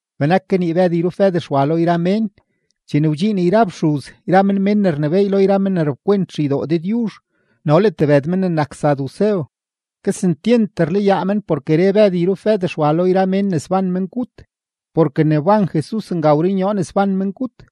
Benak kanii Bëd yrup Bëd Xwa lo yra mén, chene wdxiin yra fxuz yra men mén ne rnebééy lo yra men ne rap kwent xeydoo Dëdyuzh no le tebëd men ne nak sadusew. Kesentyent rlayaa men porke re Bëd yrup Bëd Xwa lo yra mén ne sban mengut, porke ne wban Jesus nga wrunyoo ne sban mengut.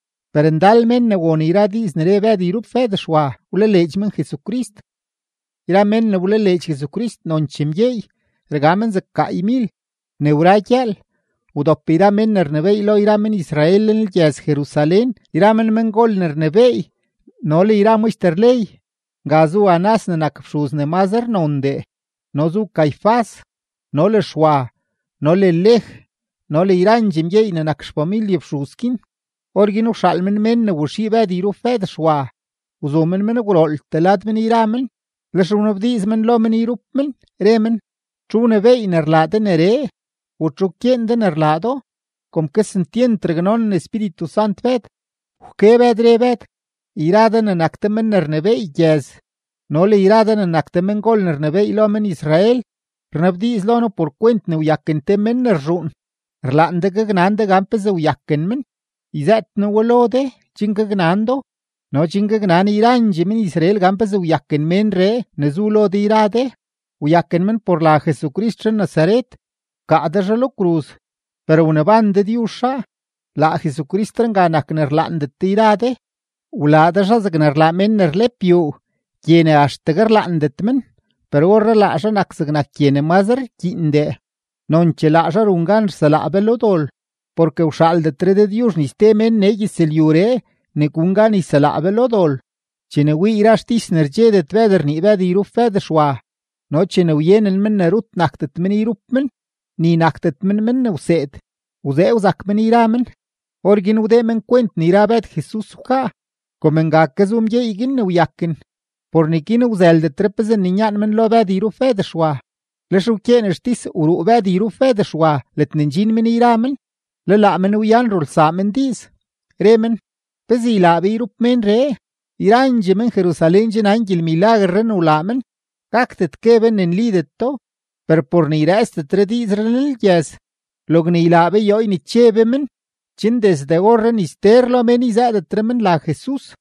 Per ndal mén ne won yra diiz ne re Bëd yrup Bëd Xwa, wlaleedx men Jesucrist. Yra mén ne wlaleedx Jesucrist nonchee mgyeey, rga men zeg gaaymil. Ne wra gyëël, wdop yra mén ne rnebééy lo yra men-Israel lenlgyëz-Jerusalén yra men mengol ne rnebééy no le yra maxter ley. Nga zu Anás ne nak fxuz ne mazre nondee, no zu Caifás no le Xwa no le Lej no le yrandxee mgyeey ne nak xfamilye fxuz guin. Orguin wxaal men mén ne waxii Bëd yrup Bëd Xwa, wzu men men gwrooltee lad men yra men, lex wnabdiiz men lo men yrup men, re men: ―¿Txu wnebééy ne rlaa de neree? ¿U txu wkyeen de ne rlaa do? Kom kesentyent raknonen Espíritu Sant Bëd, wke Bëd, re Bëd: ―Yra de ne nak de men ne rnebééy gyëz no le yra de ne nak de mengol ne rnebééy lo men-Israel rnabdiiz lo noo por kwent ne wyaken te mén ne rzhuun; rlaan de gaknan de gan pezee wyaken men. Yzëët noo we lo de chen gaknan do no chen gaknan yrandxee men-Israel gan pezee wyaken ménree ne zu lo de yra de: Wyaken men por la Jesucrist zhan-Nazaret; wkaa de zhaa lo kruz, per wneban Dëdyuzh zhaa. Laa Jesusree nga nak ne rlaandet de yra de, wlaa de zhaa zegne rlaa mén ne rlep yuu gye ne axtegue rlaandet men, per orree laa zhaa nak zegnak gye ne mazre rkyiindee. Nonchee laa zhaa run gan rselaa be lo dol, porke wxaaldetre Dëdyuzh ni ste mén nee gyëzlyuree ne gun gan yselaa be lo dol. Chene wii yra xtis ne rdxedet Bëd rnii Bëd yrup Bëd Xwa no chene wyenen men ne rut nakdet men yrup men, ni nakdet men men ne wseed, wzee wzak men yra men; orguin wdee men kwent ne yra Bëd Jesus wkaa. Kom nga ke zu mgyeey guin ne wyaken, por neguin wzëldetre pezee ninyaan men lo Bëd yrup Bëd Xwa. Lex wkyeen xtis wruu Bëd yrup Bëd Xwa ledne ndxin men yra men, le laa men wyan rulsaa men diiz, re men: ―¿Pezee ylaa be yrup ménree? Yrandxee men-Jerusalén che nan gyelmilaguerree ne wlaa men, gakdet gue be ne nlideto. Per por ne yrëëtsdetre diizree lenlgyëz, logne ylaa be yoo yneche be men, chen desde orree ni ster lo mén yzëëdetre men la Jesus.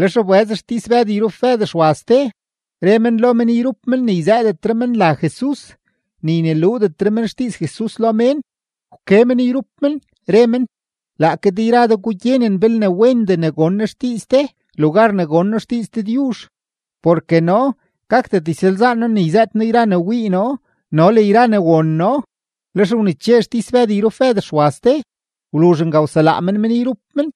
Lex wbëz xtis Bëd yrup Bëd Xwa ste, re men lo men yrup men ne yzëëdetre men la Jesus, ni yneluudetre men xdiiz Jesus lo mén. Wke men yrup men, re men: ―Laake de yra de gugyenen belne wendee ne gon noo xdiiz de lugar ne gon noo xdiiz Dëdyuzh. Porke noo gakdet ysalzaan noo ne yzëët noo yra ne wii noo no le yra ne won noo. Lex wneche xtis Bëd yrup Bëd Xwa ste; wluzh nga wselaa men men yrup men.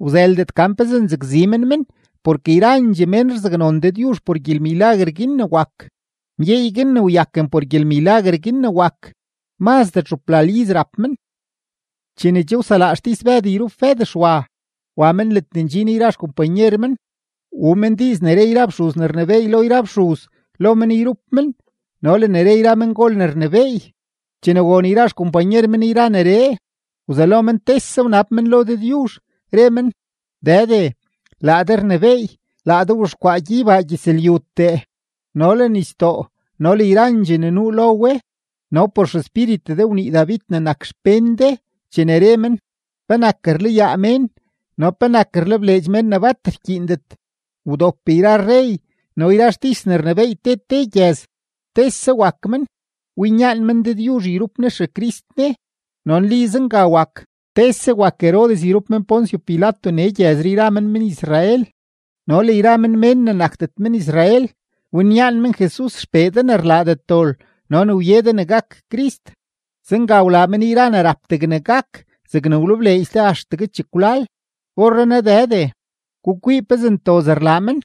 Wzëldet gan pezee nzakzi men men porke yrandxee mén rzaknon Dëdyuzh por gyelmilaguer guin ne wak. Mgyeey guin ne wyaken por gyelmilaguer guin ne wak, mazdee txuplal iz rap men. Chene che wselaa xtis Bëd yrup Bëd Xwa, wa men ledne ndxin yra xkompanyer men, wuu men diiz ne re yra fxuz ne rnebééy lo yra fxuz lo men yrup men no le ne re yra mengol ne rnebééy. Chene won yra xkompanyer men yra neree, wzelo men tese wnab men lo Dëdyuzh, re men: ―Dëde, laa de rnebééy, laa de wzhexkwaa gyeybaa gyëzlyutee no le nisdoo no le yrandxee ne nuu lo we. No por XEspíritu de wnii David ne nak xpén de chene re men: ¿Penak rlayaa mén no penak rlebleedx mén ne bat rkyiindet? Wdop yra rrey no yra xtis ne rnebééy te te gyëz tese wak men winyaan men Dëdyuzh yrup Ne XeCrist Ne. ’No nli zenga wak, tese wak Herodes yrup men Poncio Pilato nee gyëzree yra men men-Israel no le yra men mén ne nakdet men-Israel, winyaan men Jesus XPee de ne rlaadet dol no ne wye de ne gak Crist. Zenga wlaa men yra ne rap degne gak zegne wlebleedx de axtegue chekwlal. Orrenaa Dëde, gukwii pezee ntoz rlaa men,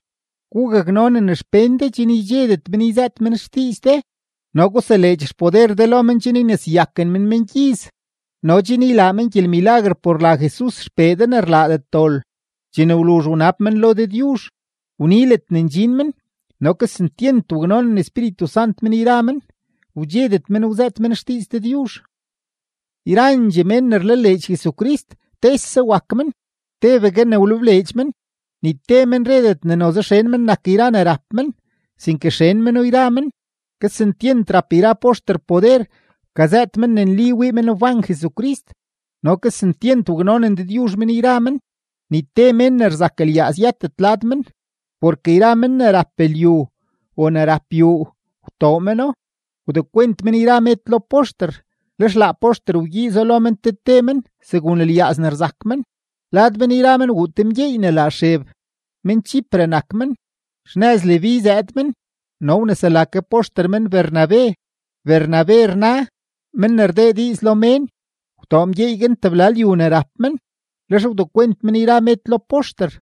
gugaknonen xpén de chen ydxedet men yzëët men xdiiz de, no guseleedx xpoder de lo men chen yneseyaken men mengyiz no chen ylaa men gyelmilaguer por la Jesus XPee de ne rlaadet dol. Chene wluzh wnab men lo Dëdyuzh, wni ledne ndxin men; no kesentyent waknonen Espíritu Sant men yra men, wdxedet men wzëët men xdiiz Dëdyuzh. Yrandxee mén ne rlaleedx Jesucrist, tese wak men, tebegue ne wlebleedx men; ni te men redet ne noze xen men nak yra ne rap men, sinke xen meno yra men. Kesentyent rap yra poxter poder wkazëët men ne nli wii men wban Jesucrist, no kesentyent waknonen Dëdyuzh men yra men. Ni te mén ne rzak lyaaz yëtet lad men, porke yra men ne rap lyu o ne rap yuu, wtoo meno, wdekwent men yra med lo poxter, lex laa poxter wgyiizo lo men te te men segun lyaaz ne rzak men. Lad men yra men wuu te mgyeey ne la Xeb, men-Chipre nak men; xnëz Leví zëëd men no wnesela ke poxter men Bernabe. (Bernabe rna: Men ne rdee diiz lo mén.) Wtoo mgyeey guin tebla lyu ne rap men, lex wdekwent men yra med lo poxter.